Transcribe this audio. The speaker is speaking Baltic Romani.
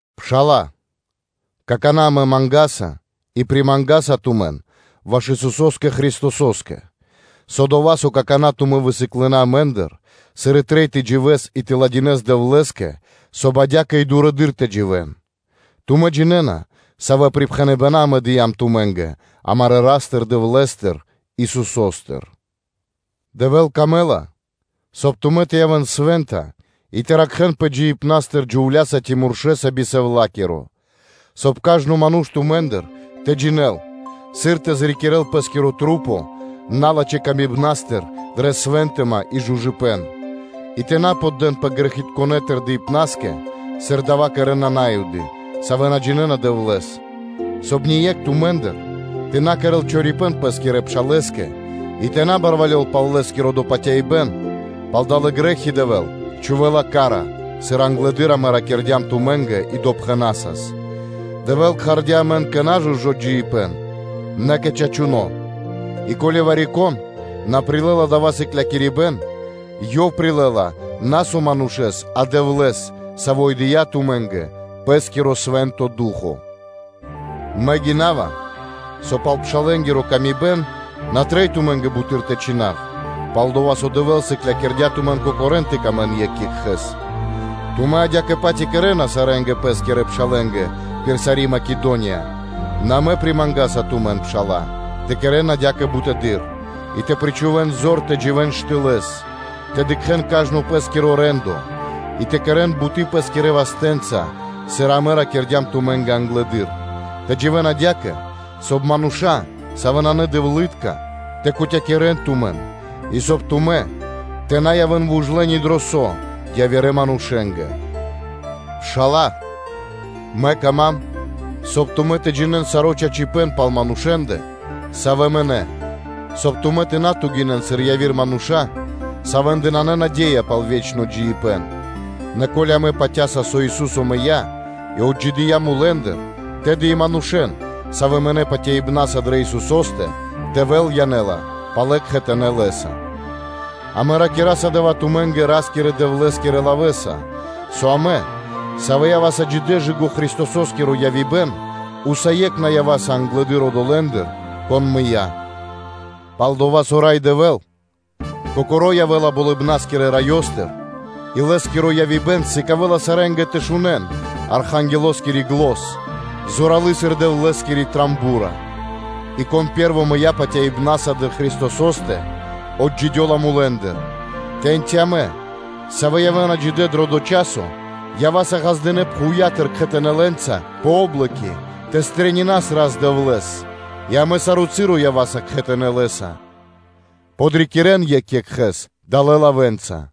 Пшала́лэ, какана́ амэ мангаса и примангаса тумэн ваш Исусо́скэ Христосо́скэ, со дова́, со какана́ тумэ́ высыклынэ амэ́ндыр, сыр трэй тэ дживэ́н и тэ кэрэ́н пир чачипэ́н Дэвлэ́скэ, соб (кай) адя́кэ и дурэды́р тэ дживэ́н. Тумэ́ джинэ́на, савэ́ припхэныбэна́ амэ дыям тумэ́нгэ амарэ́ Ра́стыр-Дэвлэ́стыр Исусо́стыр. Дэвэ́л выкэдэ́ла, соб (кай) тумэ́ тэ явэ́н свэ́нта и тэ ракхэ́нпэ джиибнастыр би совлакиро; соб (кай) кажно ману́ш тумэ́ндыр тэ джинэ́л, сыр тэ зрикирэл пэ́скиро кхоро́ налачхэ́ тырдыпнастыр дрэ свынтыма и жужыпэн (чыстота), и тэ на поддэнпэ грэхитконэ́ тырдыпнаскэ, сыр дава́ кэрэ́на На́юды, савэ́ на джинэ́на Дэвлэ́с, соб (кай) ние́кх тумэ́ндыр тэ на кэрэ́л чорипэ́н пэ́скирэ пшалэ́скэ и тэ на барвалёл пал лэ́скиро допатяибэн, пал далэ́ грэ́хи Дэвэ́л чхувэ́ла ка́ра, сыр англэды́р амэ ракирдям тумэ́нгэ и допхэнасас. Дэвэ́л кхардя́ амэн на кэ нажужо джиибэ́н, нэ кэ чачуно́. И ко́ли вари-кон на прилэ́ла дава́ сыклякирибэ́н, ёв прилэ́ла на, со манушэ́с, а Дэвлэ́с, Саво́ и дыя́ тумэ́нгэ Пэ́скиро Свэ́нто Ду́хо (Фа́но). Мэ гинава, со пал пшалэнгири паты́в на трэй тумэ́нгэ буты́р тэ чхинав, пал-дова́ со Дэвэ́л сыклякирдя́ тумэн кокорэн тэ сыкавэ́н паты́в екх екхэ́скэ. Тумэ́ адя́кэ-паць и кэрэ́на сарэ́нгэ пэ́скирэ пшалэ́нгэ пир сари́ Македония; нэ амэ примангаса тумэн, пшала́лэ, тэ кэрэ́н адя́кэ бутэды́р; и тэ причхувэ́н зор тэ дживэ́н штылэ́с, тэ дыкхэ́н кажно пэ́скиро рэ́ндо, и тэ кэрэ́н буты́ пэ́скирэ вастэ́нца, сыр амэ ракирдям тумэ́нгэ англэды́р; тэ дживэ́н патывалэс адя́кэ, соб (кай) мануша́, савэ́ исын надэвлытка, тэ кутякирэн тумэн, и соб (кай) тумэ́ тэ на явэ́н вужлэ ни дро со явирэ манушэ́нгэ. Пшала́лэ, мэ кама́м, соб (кай) тумэ́ тэ джинэ́н саро́ чачипэ́н, пал манушэ́ндэ, савэ́ мынэ́, соб (кай) тумэ́ на тугинэн, сыр яви́р мануша́, савэ́ндэ нанэ наде́я пал ве́чно джиибэ́н. Нэ ко́ли амэ патя́са, со Ису́со мыя́ и отджидыя́ мулэ́ндыр, тэды и манушэ́н, савэ́ мынэ́ патяибна́са дрэ Исусо́стэ, Дэвэ́л янэ́ла палэ кхэтанэ́ Лэ́са. Амэ ракираса дава́ тумэ́нгэ Ра́скирэ-Дэвлэ́скирэ лавэ́са, со амэ, савэ́ ява́са джидэ́ кэ / жы́ко Христосо́скиро явибэн, усае́кх на ява́са англэды́р одолэ́ндыр, кон мыя́; пал-дова́ со Рай Дэвэ́л Кокоро́ явэ́ла Болыбна́скирэ Раёстыр и Лэ́скиро явибэн сыкавэ́ла сарэ́нгэ тэ шунэ́н Архангелоскири зан, зоралы́ сыр Дэвлэ́скиро ро́го (труба), и кон пэ́рво мыя́ патяибна́са дрэ Христосо́стэ, отджидёла мулэ́ндыр; тэ́ньчи амэ, сэвэ явэ́на джидэ́ дро дова́ часо, ява́са ґаздынэ́ пхувья́тыр, кхэтанэ́ лэ́нца пэ о́блоки тэ стрэнинас (тэ пирилас) Рас-Дэвлэ́с и амэ саро́ часо ява́са кхэтанэ́ Лэ́са. Подрикирэн екх екхэ́с далэ́ лавэ́нца.